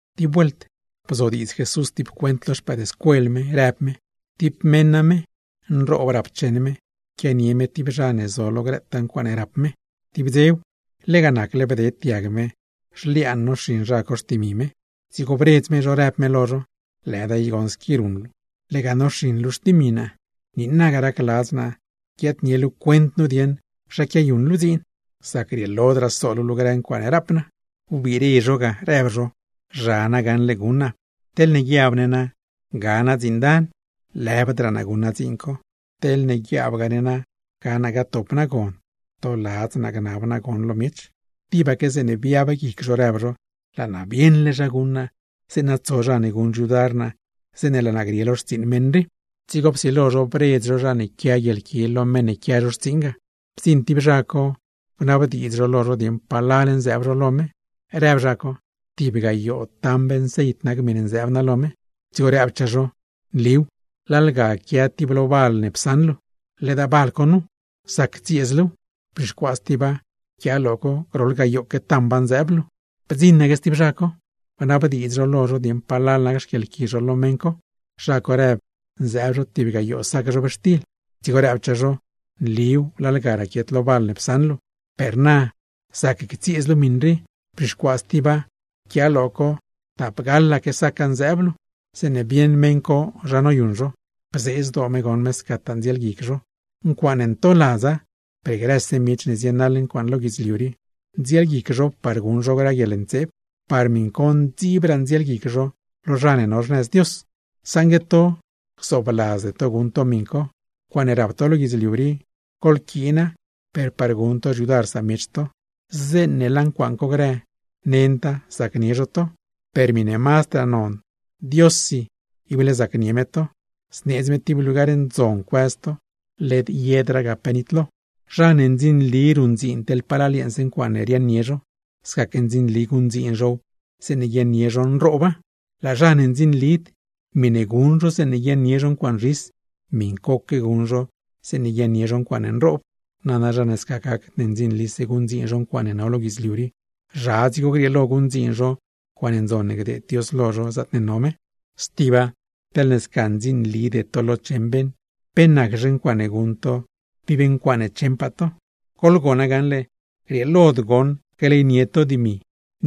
Tib vuelt bzodiidz Jesús tib cuent lo xpëëdscuel me, rëb me: ―Tib meṉ name nroob rapcheṉ me, quianie me tib zha ne zo lo grëtaa ncuaaṉe rap me; tib dzew, lega nacle bded diag me zhliaan noxiṉ zha co xtimi me. Dzigo bredz me zho, rëb me lo zho: “Lëda i goṉ squi ruṉ luu, lega noxiṉ luu xtimi naa. Niinaga racladz naa guiaadnie luu cuent nu dieṉ zha quiayuṉ luu dziin; sac grieelodraa so luu lo grë ncuaaṉe rap naa.” ’Wbire zho ga, rëb zho: “Zha na gaṉle guṉ naa, teḻne guiab ne ga naa dziin dan, lëbdraa naa guṉ naa dziin co; teḻ guiaabgaa ne na ga naa gatop naa gon, rtoladz naa gnab naa gon lo miech.” Tibaque zeeṉe biab guic zho rëb zho: “¡Laa naa bieṉle zha guṉ naa, zeeṉa tso zha ne guṉ xyudar naa zeeṉe laa naa grie lo xtsiiṉ meṉ rii!” ’Dzigo psilo zho bredz zho zha ne quia guieḻqui lo meṉ ne quia zho xtsiiṉ ga. Bdziṉ tib zha co bnabdiidz zho lo zho dieṉ palal nzëëb zho lo me. Rëb zha co: “Tib gayoo tamb nceit nac miṉe nzëëb naa lo me.” Dzigo rëbchaa zho: “Nliw, lalga quia lo tib val ne psaṉ luu nu. Ledaa val co nu, zac ctsieez luuw; bzhixcuaa stiba, pquiaa lo co, groḻ tamba zëëb luu.” Bdziṉaque stib zha co, bnabdiidz zho lo zho dieṉ palal nac xquieḻqui zho lo meṉ co. Zha co rëb zëëb zho tib gayoo sac zhobxtil. Dzigo rëbchaa zho: “Nliw, lalga raquiet lo val ne psaṉ luu; per na zac ctsieez luu miṉ rii, bzhixcuaa stiba, pquiaa lo co tapgaḻaque saca zëëb luu.” ’Zeeṉe bieṉ meṉ co zha noyuṉ zho, bzee zdoo me goṉ me scataa ndzielguic zho. Ncuaaṉe ntoladza, per grëse miech ne zienaḻ ncuaaṉ lo guidzliu rii, ndzielguic zho par guṉ zho grë guieḻntseeb. Par miṉ co ndziibraa ndzielguic zho lo zha ne no xnëz Dios. Saṉgue to gzoobladzde to guṉ to miṉ co, ncuaaṉe rap to lo guidzliu rii, goḻquiina per par guṉ to xyudar samiech to. Zeeṉe laa ncuaaṉ co grë, nenda zacnie zho to, per miṉe mazdraa non Diossi ible zacnie me to, zneedz me tib lugar ndzon cuëz to, led yedraa ga pe nitlo. ’Zha ne ndzinli ruṉdziin teḻ palal yeeṉse ncuaaṉe riaaṉnie zho, scaque ndzinli guṉdziin zhow zeeṉe guiaaṉnie zho nrooba. Laa zha ne ndzinlid, miṉe guṉ zho zeeṉe guiaaṉnie zho ncuaaṉ zhis, miṉcoque guṉ zho zeeṉe guiaaṉnie zho ncuaaṉe nroob. Nana zha ne sca gacd ne ndzinlise guṉdziin zho ncuaaṉe no lo guidzliu rii, ¿zha dzigo grieelo guṉdziin zho ncuaaṉ ndzon ne gdeed Dios lo zho zaatne no me? Stiba, teḻ sca ndzinlide to lo cheṉ beṉ, ¿pe naczhe ncuaaṉe guṉ to tib ncuaaṉe cheṉpaa to? Goḻgona gaṉle, grieelod goṉ gleynie to dimi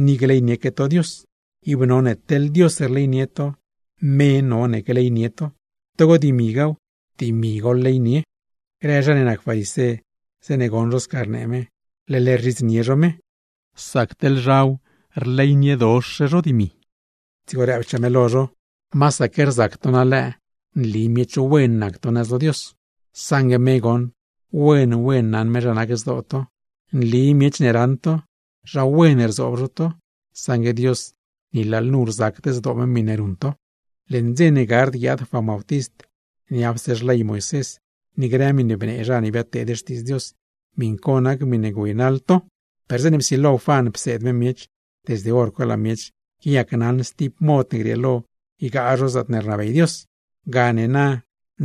ni gleynieque Dios. Ib none teḻne Dios rleynie to, me none gleynie to, togo dimigaaw, dimi goḻleynie. Grë zha ne nac farisé zeeṉe goṉ zho sca rnee me, leḻ rzhidznie zho me, sac teḻ zhaw rleyniedox zho dimi. Dzigo rëbchaa me lo zho: ―Masaque rzac to nalëë nli miech wen nac to nëz lo Dios, saṉgue me goṉ, wen wen naṉ me zha nac zdoo to. Nli miech ne raṉ to, zha wen rzoob zho to; saṉgue Dios ni lalnu rzacd zdoo me miṉe ruṉ to. ’Leṉ dze ne gard guiaad Juan Bautist, niapse xley Moisés ni grë miṉe bnee zha ne biadteed xtiidz Dios, miṉ co nac miṉe güeynaḻ to. Per zeeṉe psilo Juan pseed me miech, desde hor co laa miech quiayacnaṉ stib mod ne grieelo ygaa zho zaatne rnabey Dios; gane na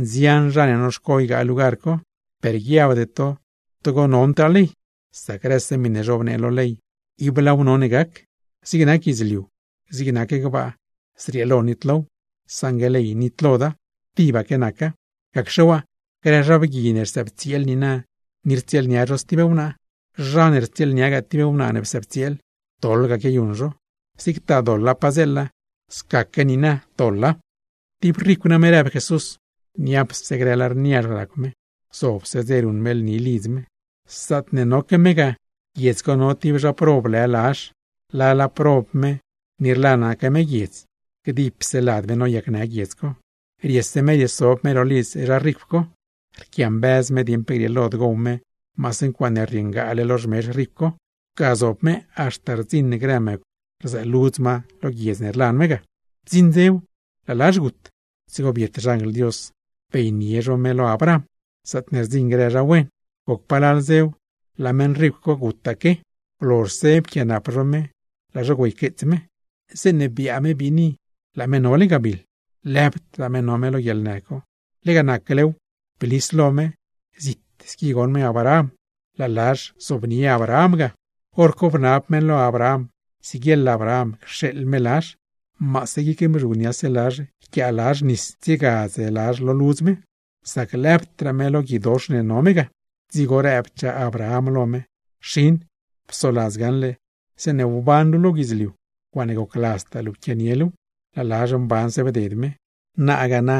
nzian zha ne noxco ygaa lugar co. Per guiabde to togo nondraa ley, sac grëse miṉe zhobnee lo ley, ¡ib laaw none gac! ¡Zig nac guidzliu, zig nac gbaa zrieelo nitlow, saṉgue ley nitloda, tibaque naca! Gacxe waa, grë zha bgui ne rsëbtsieel niina ni rtsieelnia zho stib wnaa, zha ne rtsieelniagaa tib wnaa ne psëëbtsieel, doḻ ga quiayuṉ zho; zigtaa doḻa padzeela, scaque niina doḻa. ’Tib ricw name ―rëb Jesús―, niapse grë lar niazh racw me, gzobse dze ruṉ me lni lidz me. Zaatne noque me ga, guiedz co no tib zha prob lë Lazh, lala prob me ni rlanaque me guiedz, gdipse lad me noyacnë guiedz co. Riese me riesob me ro lidz zha ricw co, rquiambëz me dieṉ pe grieelod gow me maase ncuaaṉe rrieengaale lo xmezh meṉ co; ga zob me haxta rdziṉ grë mëcw rzëëludz ma lo guiedz ne rlan me ga. ’Bdziṉ dzew laa Lazh gut, dzigo biet xanjl Dios beynie zho me lo Abraham, zaatne rdziṉ grë zha wen. Goc palal dzew, laa meṉ ricw co gutaque, blozhse pquianap zho me, laa zho güeyqueets me; zeeṉe biaa me biini laa me nole gabiḻ. Lëbdraa me no me lo guieḻnë co, lega naclew blis lo me, zit squi goṉ me Abraham, laa Lazh zobnie Abraham ga. Horco bnab me lo Abraham siguieḻ Abraham cxeeḻ me Lazh, maase guic mzhugniase Lazh yquiaa Lazh nis tsiegadz Lazh lo ludz me; sac lëbdraa me lo guidox ne no me ga. Dzigo rëbchaa Abraham lo me: “Xin, psoladz gaṉle zeeṉe wban luu lo guidzliu, ncuaaṉe gocladztaa luu pquianie luuw; laa Lazh mbanse bded me. Nagaa na,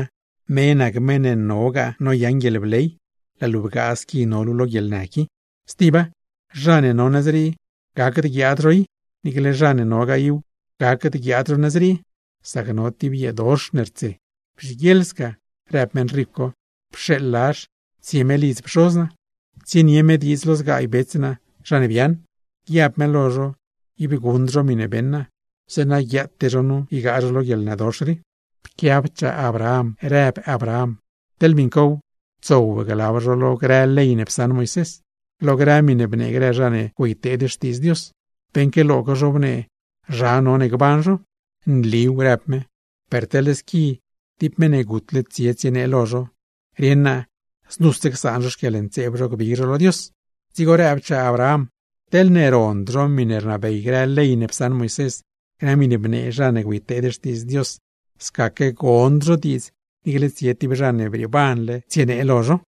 me nac meṉ ne nogaa noyaṉ guieḻbley, laa luu bgaa squi no luu lo guieḻnë qui. Stiba, zha ne no nëz rii gacd guiaad zho i, niicle zha ne nogaa iw, gacd guiaad zho nëz rii; sac no tib yeedox ne rtse.” “Bzhiguieḻ sca”, rëb meṉ ricw co, “pxeeḻ Lazh tsie me lidz pxoz naa, tsienie me diidz lo zgaay bets naa zha ne biaaṉ, guiab me lo zho ib guṉd zho miṉe beṉ naa, zeeṉa guiaate zho nu ygaa zho lo guieḻnëdox rii.” Pquiabchaa Abraham, rëb Abraham: “Teḻ miṉcow, tsow glab zho lo grë ley ne psaṉ Moisés, lo grë miṉe bnee grë zha ne güeyteed xtiidz Dios, beṉque lo co zhobnee zha no gban zho.” “Nliw”, rëb me, “per teḻ squi tib meṉ ne gutle tsie tsienee lo zho, rieṉ naa znuse csaan zho xquieḻntseeb zho gbig zho lo Dios.” Dzigo rëbchaa Abraham: “Teḻne rond zho miṉe rnabey grë ley ne psaṉ Moisés, grë miṉe bnee zha ne güeyteed xtiidz Dios, scaque gond zho diidz niicle tsie tib zha ne brieebanle tsienee lo zho.”